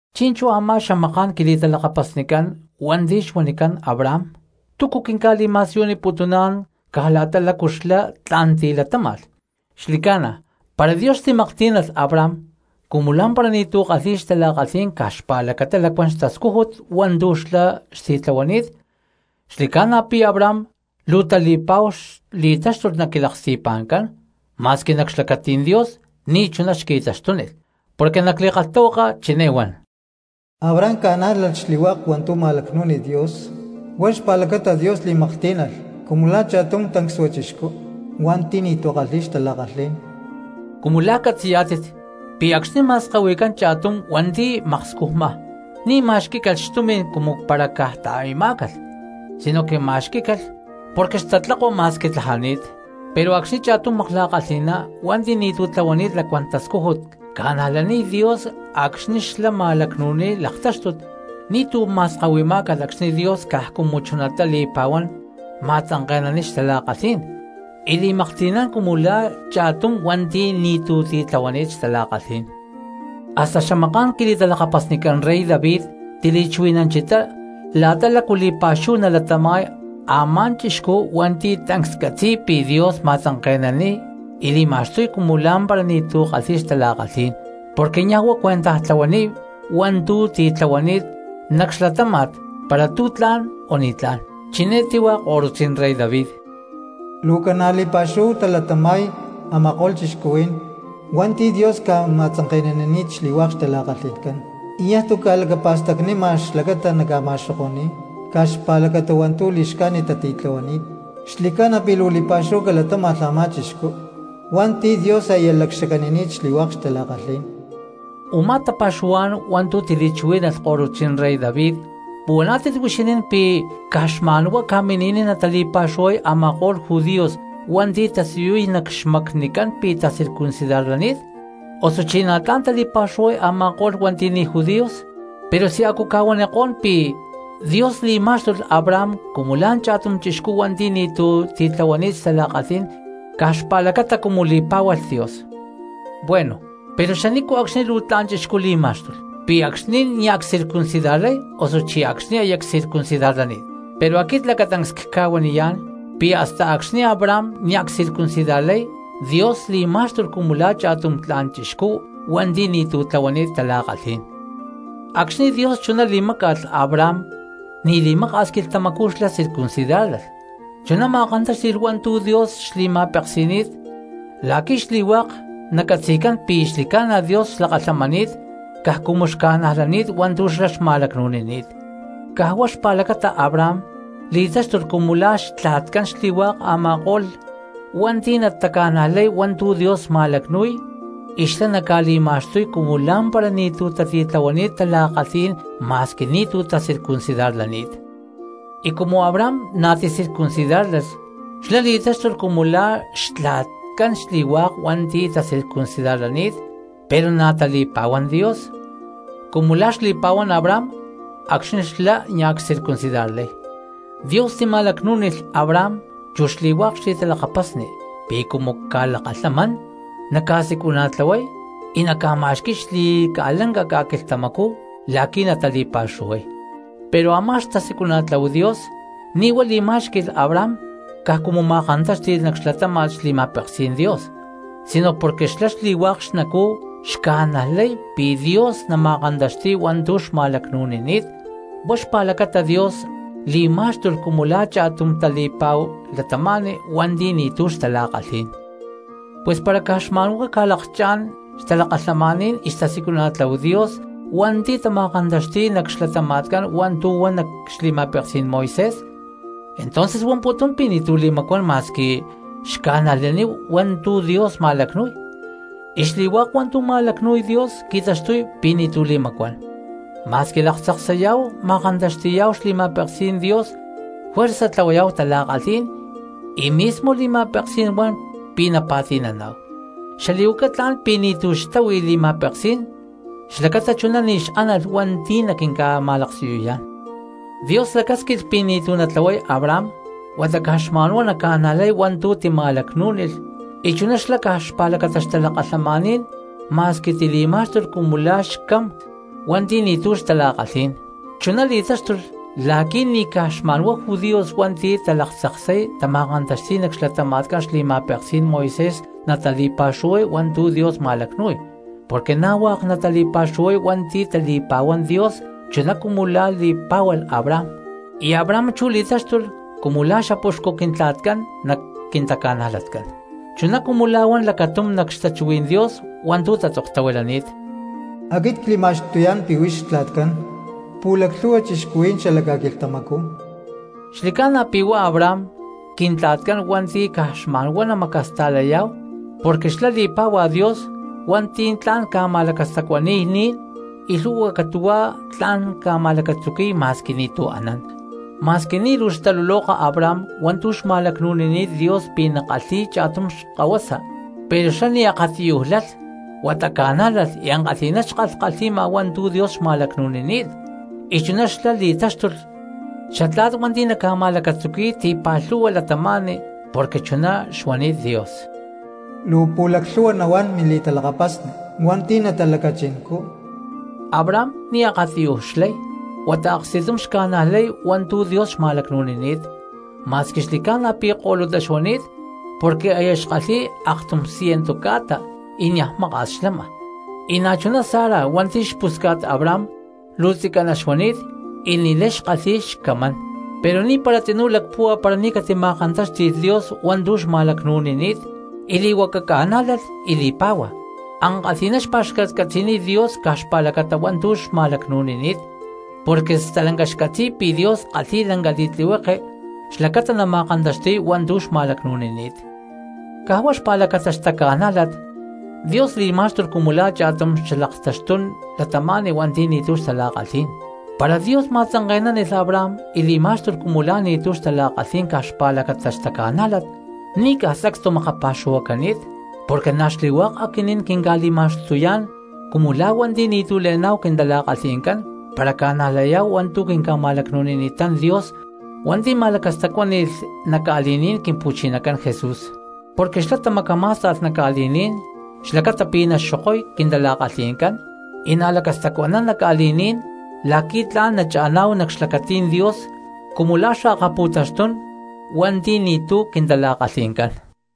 Chi̠nchú a̠má xamaká̠n quili̠talakapasnicán hua̠nti̠ xuanicán Abraham, ¿túcu quinca̠li̠ma̠siyuniputuná̠n caj la̠ta lácu xlá tla̠n tilatáma̠lh? Xli̠ca̠na, para Dios xtili̠maklhtí̠nalh Abraham cumu la̠ tancsua cristianos hua̠nti̠ ni̠tu̠ xtala̠kalhí̠n caj xpa̠lacata lacuán xtascújut hua̠ntu̠ xlá xtitlahuani̠t, xli̠ca̠na pi̠ Abraham luu tali̠pa̠hu xli̠táxtulh nac quilaksti̠pa̠ncán, ma̠squi nac xlacatí̠n Dios ni̠chuná xqui̠taxtúnilh. Porque nac li̠kalhtahuaka chiné huan: “Abraham ca̠nájlalh xli̠hua̠k hua̠ntu̠ ma̠lacnú̠nilh Dios huá xpa̠lacata Dios li̠maklhtí̠nalh cumu la̠ cha̠tum tancsua chixcú hua̠nti̠ ni̠tu̠ kalhi̠y xtala̠kalhí̠n.” Cumu la̠ catzi̠yá̠tit pi̠ acxni̠ ma̠skahui̠cán cha̠tum cristiano hua̠nti̠ xmakscujma, ni̠ ma̠xquí̠calh xtumi̠n cumu para caj ta̠i̠má̠calh, sinoque ma̠xqui̠má̠calh porque xtatlakua ma̠squi tlajani̠t. Pero acxni̠ cha̠tum makla̠kalhi̠na cristiano hua̠nti̠ ni̠tu̠ tlahuani̠t lacuán tascújut ca̠najlaniy Dios acxni̠ xlá ma̠lacnu̠niy laktáxtut, ni̠tu̠ ma̠skahuimá̠calh acxni̠ Dios caj cumu chuná li̠pa̠huán ma̠tzanke̠naniy xtala̠kalhí̠n y li̠maklhti̠nán cumu la̠ cha̠tum tancsua cristiano hua̠nti̠ ni̠tu̠ titlahuani̠t xtala̠kalhí̠n. Hasta xamaká̠n quili̠talakapasnicán rey David tili̠chuhui̠nanchitá la̠ta lácu li̠pa̠xúhu nalatama̠y a̠má chixcú hua̠nti̠ tancs catzi̠y pi̠ Dios ma̠tzanke̠naniy y li̠ma̠xtuy cumu lá̠mpara ni̠tu̠ kalhi̠y xtala̠kalhí̠n, porque niaj huá cuentaj tlahuaniy hua̠ntu̠ titlahuani̠t nac xlatáma̠t para tu̠ tla̠n o ni̠tlá̠n. Chiné tíhua ko̠rutzí̠n rey David: ¡Luu ca̠na̠ li̠pa̠xúhu talatama̠y a̠ma̠ko̠lh cristianos hua̠nti̠ Dios ca̠ma̠tzanke̠nanini̠t xli̠hua̠k xtala̠kalhi̠ncán y niaj tu̠ ca̠lacapa̠stacnima xlacata naca̠ma̠xoko̠ni̠y caj xpa̠lacata hua̠ntu̠ li̠xcájnit tatitlahuani̠t! ¡Xli̠ca̠na pi̠ luu li̠pa̠xúhu calatáma̠lh a̠má chixcú hua̠nti̠ Dios aya lacxacanini̠t xli̠hua̠k xtala̠kalhí̠n! Umá tapa̠xuhuá̠n hua̠ntu̠ tili̠chuhuí̠nalh korutzí̠n rey David, ¿puhuaná̠tit huixinín pi̠ caj xma̠nhuá ca̠mini̠niy natali̠pa̠xuhuay a̠ma̠ko̠lh judíos hua̠nti̠ tasiyuy nac xmacnicán pi̠ tacircuncidarlani̠t, osuchí na̠tlá̠n tali̠pa̠xuhuay a̠ma̠ko̠lh cristianos hua̠nti̠ ni̠ judíos? Pero si a̠cu cca̠huanikó̠n pi̠ Dios li̠má̠xtulh Abraham cumu la̠ cha̠tum chixcú hua̠nti̠ ni̠tu̠ titlahuani̠t xtala̠kalhí̠n caj xpa̠lacata cumu li̠pá̠hualh Dios. Bueno, pero ¿xanico̠cxni luu tla̠n chixcú li̠má̠xtulh? ¿Pi̠ acxni̠ nia̠ ccircuncidarlay, osuchí acxni̠ aya csircuncidarlani̠t? Pero aquit lacatancs cca̠huaniyá̠n pi̠ hasta acxni̠ Abraham nia̠ csircuncidarlay Dios li̠má̠xtulh cumu la̠ cha̠tum tla̠n chixcú hua̠nti̠ ni̠tu̠ tlahuani̠t tala̠kalhí̠n. Acxni̠ Dios chuná li̠máca̠lh Abraham ni̠ li̠maka̠s quilhtamacú xlá circuncidárlalh, chuná ma̠kantáxti̠lh hua̠ntu̠ Dios xli̠ma̠peksi̠ni̠t la̠qui̠ xli̠hua̠k nacatzi̠cán pi̠ xli̠ca̠na Dios xlakalhamani̠t caj cumu xca̠najlani̠t hua̠ntu̠ xlá xma̠lacnu̠nini̠t. Caj huá chuná eé xpa̠lacata Abraham li̠taxtuy cumu la̠ xtla̠tcán xli̠hua̠k a̠ma̠ko̠lh cristianos hua̠nti̠ nataca̠najlay hua̠ntu̠ Dios ma̠lacnu̠y y xlá naca̠li̠ma̠xtuy cumu lá̠mpara ni̠tu̠ tatitlahuani̠t tala̠kalhí̠n ma̠squi ni̠tu̠ tacircuncidarlani̠t. Y cumu Abraham na̠ ticircuncidárlalh xlá li̠taxtuy cumu la̠ xtla̠tcán xli̠hua̠k hua̠nti̠ tacircuncidarlani̠t pero na̠ tali̠pa̠huán Dios cumu la̠ xli̠pa̠huán Abraham acxni̠ xlá nia̠ csircuncidarlay. Dios tima̠lacnú̠nilh Abraham chu xli̠hua̠k xli̠talakapasni pi̠ cumu ca̠lakalhamán naca̠siculana̠tlahuay y naca̠ma̠xqui̠y xli̠ca̠lanca ca̠quilhtamacú la̠qui̠ natali̠pa̠xuhuay. Pero a̠má xtasiculana̠tláhu Dios ni̠ huá li̠má̠xqui̠lh Abraham caj cumu ma̠kantáxti̠lh nac xlatáma̠t xli̠ma̠peksí̠n Dios, sino porque xlá xli̠hua̠k xnacú xca̠najlay pi̠ Dios nama̠kantaxti̠y hua̠ntu̠ xma̠lacnu̠nini̠t. Huá xpa̠lacata Dios li̠má̠xtulh cumu la̠ cha̠tum tali̠pa̠hu cristiano hua̠nti̠ ni̠tu̠ xtala̠kalhí̠n. Pus para caj xma̠nhuá ca̠lakchá̠n xtalakalhamaní̠n y xtasiculana̠tláhu Dios hua̠nti̠ tama̠kantaxti̠y nac xlatama̠tcán hua̠ntu̠ huan nac xli̠ma̠peksí̠n Moisés, entonces huamputún pi̠ ni̠tu̠ li̠macuán ma̠squi xca̠najlaníhu hua̠ntu̠ Dios ma̠lacnu̠y, y xli̠hua̠k hua̠ntu̠ ma̠lacnu̠y Dios qui̠taxtuy pi̠ ni̠tu̠ li̠macuán. Ma̠squi laktzaksayá̠hu ma̠kantaxti̠yá̠hu xli̠ma̠peksí̠n Dios juerza tlahuayá̠hu tala̠kalhí̠n y mismo li̠ma̠peksí̠n huan pi̠ napa̠ti̠naná̠hu; xalí̠huaca tla̠n pi̠ ni̠tu̠ xtáhui li̠ma̠peksí̠n xlacata chuná ni̠ xánalh hua̠nti̠ naquinca̠ma̠laksiyuyá̠n. Dios lacásquilh pi̠ ni̠tu̠ natlahuay Abraham huata caj xma̠nhuá naca̠najlay hua̠ntu̠ tima̠lacnú̠nilh y chuná xlá caj xpa̠lacata xtalakalhamaní̠n ma̠squi tili̠má̠xtulh cumu la̠ xcamán hua̠nti̠ ni̠tu̠ xtala̠kalhí̠n. Chuná li̠táxtulh la̠qui̠ ni̠ caj xma̠nhuá judíos hua̠nti̠ talaktzaksay tama̠kantaxti̠y nac xlatama̠tcán xli̠ma̠peksí̠n Moisés natali̠pa̠xuhuay hua̠ntu̠ Dios ma̠lacnu̠y, porque na̠ hua̠k natali̠pa̠xuhuay hua̠nti̠ tali̠pa̠huán Dios chuná cumu la̠ li̠pá̠hualh Abraham. Y Abraham chú li̠taxtuy cumu la̠ xapuxcu quintla̠tcán nac quintaca̠najlatcán. Chuná cumu la̠ huan lacatum nac xtachuhuí̠n Dios hua̠ntu̠ tatzoktahuilani̠t: “Aquit cli̠ma̠xtuyá̠n pi̠ huix xtla̠tcán pu̠laclhu̠hua cristianos xala ca̠quilhtamacú.” Xli̠ca̠na pi̠ huá Abraham quintla̠tcán hua̠nti̠ caj xma̠nhuá namacasta̠layá̠hu porque xlá li̠pá̠hua Dios hua̠nti̠ tla̠n ca̠ma̠lacastacuani̠y ni̠n, y lhu̠hua catu̠huá tla̠n ca̠ma̠lacatzuqui̠y ma̠squi ni̠tu̠ anán. Ma̠squi ni̠ luu xtaluloka Abraham hua̠ntu̠ xma̠lacnu̠nini̠t Dios pi̠ nakalhi̠y cha̠tum xkahuasa, pero xlá ni̠ akatiyuj lalh huata ca̠nájlalh y ankalhi̠ná xkalhkalhi̠ma hua̠ntu̠ Dios xma̠lacnu̠nini̠t. Y chuná xlá li̠táxtulh “xatla̠t hua̠nti̠ naca̠ma̠lacatzuqui̠y ti̠pa̠lhu̠hua cristianos”, porque chuná xuanini̠t Dios: “Luu pu̠laclhu̠hua nahuán mili̠talakapasni hua̠nti̠ natalacachincú.” Abraham ni̠ akatiyuj xlay huata aksti̠tum xca̠najlay hua̠ntu̠ Dios xma̠lacnu̠nini̠t, ma̠squi xli̠ca̠na pi̠ ko̠lutá xuani̠t porque aya xkalhi̠y aktum ciento ca̠ta y niaj maka̠s xlama, y na̠chuná Sara hua̠nti̠ xpusca̠t Abraham luu tzicaná xuani̠t y ni̠lay xkalhi̠y xcamancán. Pero ni̠para tzinú lacpúhua para ni̠ catima̠kantáxti̠lh Dios hua̠ntu̠ xma̠lacnu̠nini̠t y li̠huaca ca̠nájlalh y li̠pá̠hua. Ankalhi̠ná xpa̠xcatcatzi̠niy Dios caj xpa̠lacata hua̠ntu̠ xma̠lacnu̠nini̠t. Porque stalanca xcatzi̠y pi̠ Dios kalhi̠y lanca li̠tlihueke xlacata nama̠kantaxti̠y hua̠ntu̠ xma̠lacnu̠nini̠t. Caj huá xpa̠lacata xtaca̠nájlat, Dios li̠má̠xtulh cumu la̠ cha̠tum xalaktaxtún cristiano hua̠nti̠ ni̠tu̠ xtala̠kalhí̠n. Para Dios ma̠tzanke̠nánilh Abraham y li̠má̠xtulh cumu la̠ ni̠tu̠ xtala̠kalhí̠n caj xpa̠lacata xtaca̠nájlat, ni̠ caj sacstu makapa̠xuhuacani̠t porque na̠ xli̠hua̠k aquinín quinca̠li̠ma̠xtuyá̠n cumu la̠ cristianos hua̠nti̠ ni̠tu̠ le̠ná̠hu quintala̠kalhi̠ncán para ca̠najlayá̠hu hua̠ntu̠ quinca̠ma̠lacnu̠nini̠ta̠n Dios hua̠nti̠ ma̠lacastacuáni̠lh nac ca̠li̠ní̠n Quimpu̠chinacán Jesús. Porque xlá tamacamá̠sta̠lh nac ca̠li̠ní̠n xlacata pi̠ naxokoy quintala̠kalhi̠ncán y nalacastacuánan nac ca̠li̠ní̠n la̠qui̠ tla̠n nacha̠ná̠hu nac xlacatí̠n Dios cumu la̠ xalaktaxtún cristianos hua̠nti̠ ni̠tu̠ quintala̠kalhi̠ncán.